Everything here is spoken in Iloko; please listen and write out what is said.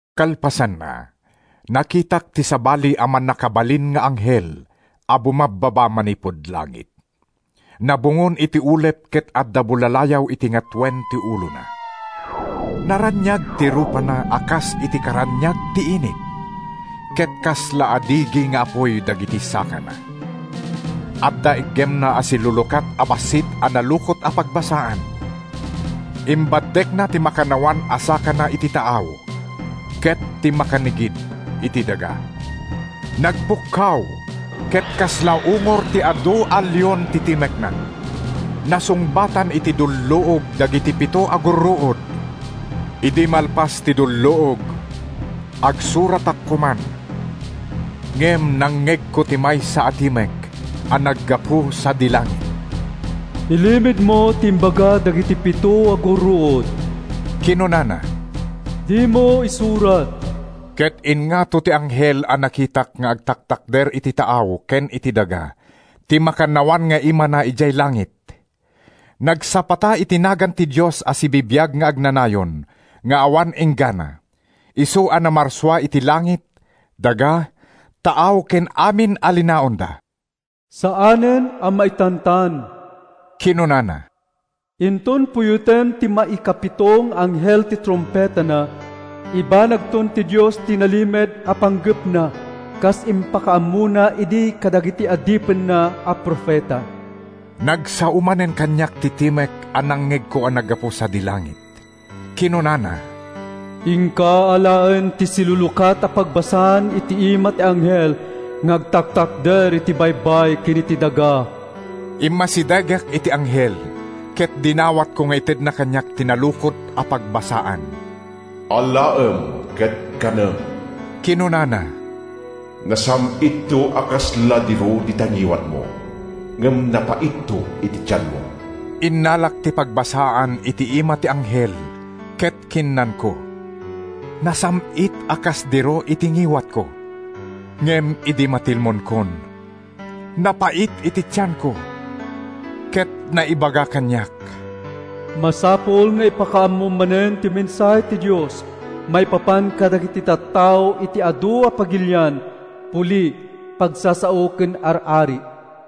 Kalpasanna, nakitak ti sabali a mannakabalin nga anghel a bumabbaba manipud langit. Nabungon iti ulep ket adda bullalayaw iti ngatoen ti ulona. Naraniag ti rupana a kas iti karaniag ti init ket kasla adigi nga apuy dagiti sakana. Adda iggemna a silulukat a bassit a nalukot a pagbasaan. Imbaddekna ti makannawan a sakana iti taaw ket ti makannigid, iti daga. Nagpukkaw ket kasla ungor ti adu a leon ti timekna. Nasungbatan iti dulluog dagiti pito a gurruod. Idi malpas ti dulluog, agsuratak koman, ngem nangngegko ti maysa a timek a naggapu sadi langit. “Ilimedmo ti imbaga dagiti pito a gurruod,” kinunana. “Dimo isurat.” Ket ingngato ti anghel a nakitak nga agtaktakder iti taaw ken iti daga ti makannawan nga imana idiay langit. Nagsapata iti nagan ti Dios a sibibiag nga agnanayon nga awan inggana, isu a namarsua iti langit, daga, taaw ken amin a linaonda. “Saanen a maitantan,” kinunana. “Inton puyoten ti maikapito nga anghel ti trumpetana, ibanagton ti Dios ti nalimed a panggepna kas impakaammona idi kadagiti adipenna a profeta.” Nagsao manen kaniak ti timek a nangngegko a naggapu sadi langit. Kinunana, “Inka alaen ti silulukat a pagbasaan iti ima ti anghel nga agtaktakder iti baybay ken iti daga.” Immasidegak iti anghel ket dinawatko nga itedna kaniak ti nalukot a pagbasaan. “Alaem ket kanem,” kinunana. “Nasam-itto a kasla diro dita ngiwatmo ngem napaitto iti tianmo.” Innalak ti pagbasaan iti ima ti anghel ket kinnanko. Nasam-it a kas diro iti ngiwatko, ngem idi matilmonkon, napait iti tianko. Ket naibaga kaniak, “Masapul nga ipakaammom manen ti mensahe ti Dios maipapan kadagiti tattao iti adu a pagilian, puli, pagsasao ken ar-ari.”